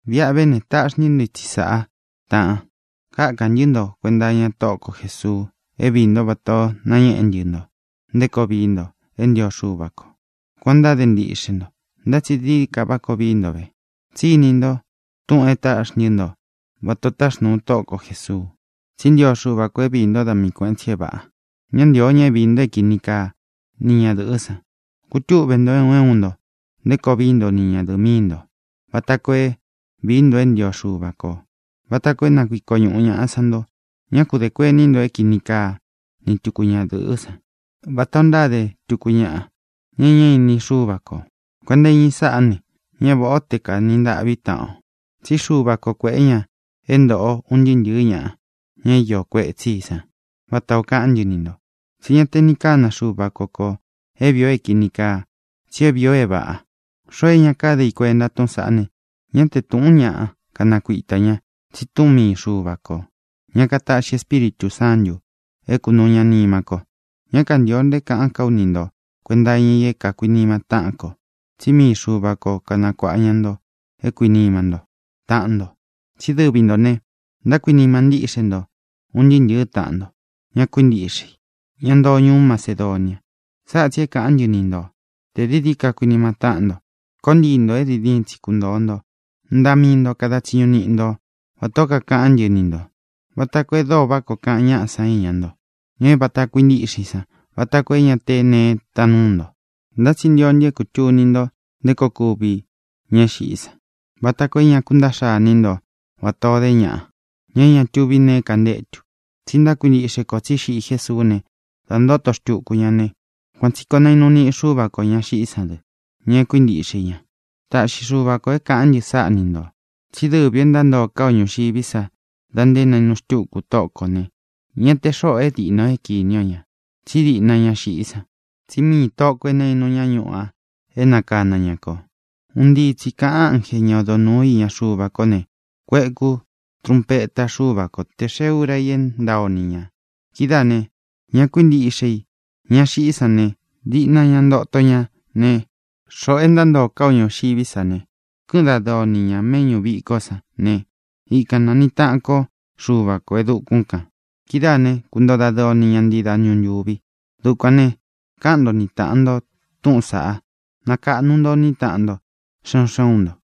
Viʼa ve ne, taʼxi ntɨ́ nto itsi sáʼa, tāʼan. Kákān ntɨ́ nto kuenta iña Tóʼo ko Jēsuu é viī ntó vatā o nañéʼé ntɨ nto nté koo vii nto é ntio Xuva kō. Kuān o ntáde ntiʼxe nto, ntá tsi dií dií ka vií nto ve. Tsí ini nto túʼūn é táʼxi ntɨ́ nto vatā o táxnūu Tóʼo ko Jēsuu. Tsí ntio Xuva kō é viī ntó da mii kuēʼen tsi é vāʼa. Ñá ntīo ña é viī nto é kini kaa ni ñadɨ̄ʼɨ́ san. Kutúʼve nto, é un é un nto, nté koo vií nto ni ñadɨ̄ʼɨ míi ntō vata koo é viī nto é ntio Xuva kō, vata koo é na kuiko ñuʼu ñāʼa san nto. Ñá ku dē kuení nto é kini kaa ni tuku ñadɨ̄ʼɨ́ san, vatā o ntáde tuku ñaʼa, ña e ñá ini Xúva kō. Kuenta iña i sáʼā ne, ña váʼa o te kanī ntaʼví taʼan o. Tsí Xuva ko kuēʼé ña é ntōʼo un ntɨɨ́ ntɨ̄ɨ́ ñaʼa, ña iō kuetsí i san, vata ō kaʼán ntɨ ni ntō. Tsí ña te ni kana Xuva ko kō é vīi o é kīni kaa, tsi é vīi o é vāʼa. Xoo é ña káde i kuenta túʼūn saʼá ne, ñá te tūʼún ñaʼa kanakuita ña, tsi túʼun mii Xuva kō, ña kataʼxi Espíritū Sántū é kunūu ña nima ko. Ñá kantīo nto é kāʼán ka ú ni nto kuēnta iña i é kuīnima táʼan kō, tsí mii Xuva ko kanakuāʼa ña nto é kuīnima ntó taʼan nto. Tsí dɨvi ntō ne, ntákuinima ntíʼxe nto un ntɨɨ́ ntɨ̄ɨ́ taʼan nto, ña kuíntiʼxe i, ña ntoo ñuú Macedonia. Sáʼa tsī é kāʼán ntɨ ni nto: Tē dií dií ka kuinima táʼan nto. Koó ntii ntō é diin diin tsi kuntōo nto. Vií nto kuenta iña mii nto. Ntaʼa mii nto kada tsiñu niʼi nto, vatā ó kakaʼán ntɨ ni ntō, vata koo e dóo vaʼá koo kaʼan ñáʼa san iña nto, ña é vāta kuintíʼxe i san, vata koo é ña te neé taan núu nto. Ntá tsi ntio ntɨ é kūtuni nto nté koo kuvi ña é xiʼí san, vata koo é ña kuntaʼxa iní nto vatā ó de ñaʼa, ña é ña tuví nee kantétu. Tsí ntákuintiʼxe kō tsí xiʼi Jésuú ne, da ntóto xtuku ña ne, kuan tsī koo nainu niʼi Xuva ko ña xiʼí san dɨ, ña e kuíntiʼxe i ña. Taʼxi Xuva kō é kāʼán ntɨ sáʼa ni ntō: Tsí dɨvi ō é ntántoo ká o ñūxiví sa da nté nainu xtúku Tóʼo kō ne, ña te xóʼō é diʼna o kīni o ña, tsí diʼna ña xiʼí san. Tsí miī Tóʼo kō nainu ñá ñuʼu a é nakana ña kō. Un ntii tsi kāʼan ánje, ña odo nūú iña Xuva kó ne, kueku trunpeta Xuva ko te e xée úra i é ntaa o ni ñā. Kidáā ne, ña kuíntiʼxe i, ña xiʼí san ne, diʼna ña ntoto ña ne, xoʼo é ntántoo ká o ñūxiví sa ne, kɨ́ʼɨn dadɨɨ o ni ña mēʼñú vikó san ne, ikan naniʼi taʼan ko Xuva kō e dukún kān. Kidáā né, kuntoo dadɨɨ o ni ña ntii dañu ntūvi. Dukuān ne, káʼan nto ni tāʼan nto túʼūn saʼá, nakaʼnu nto iní taʼan nto xé un xé un nto.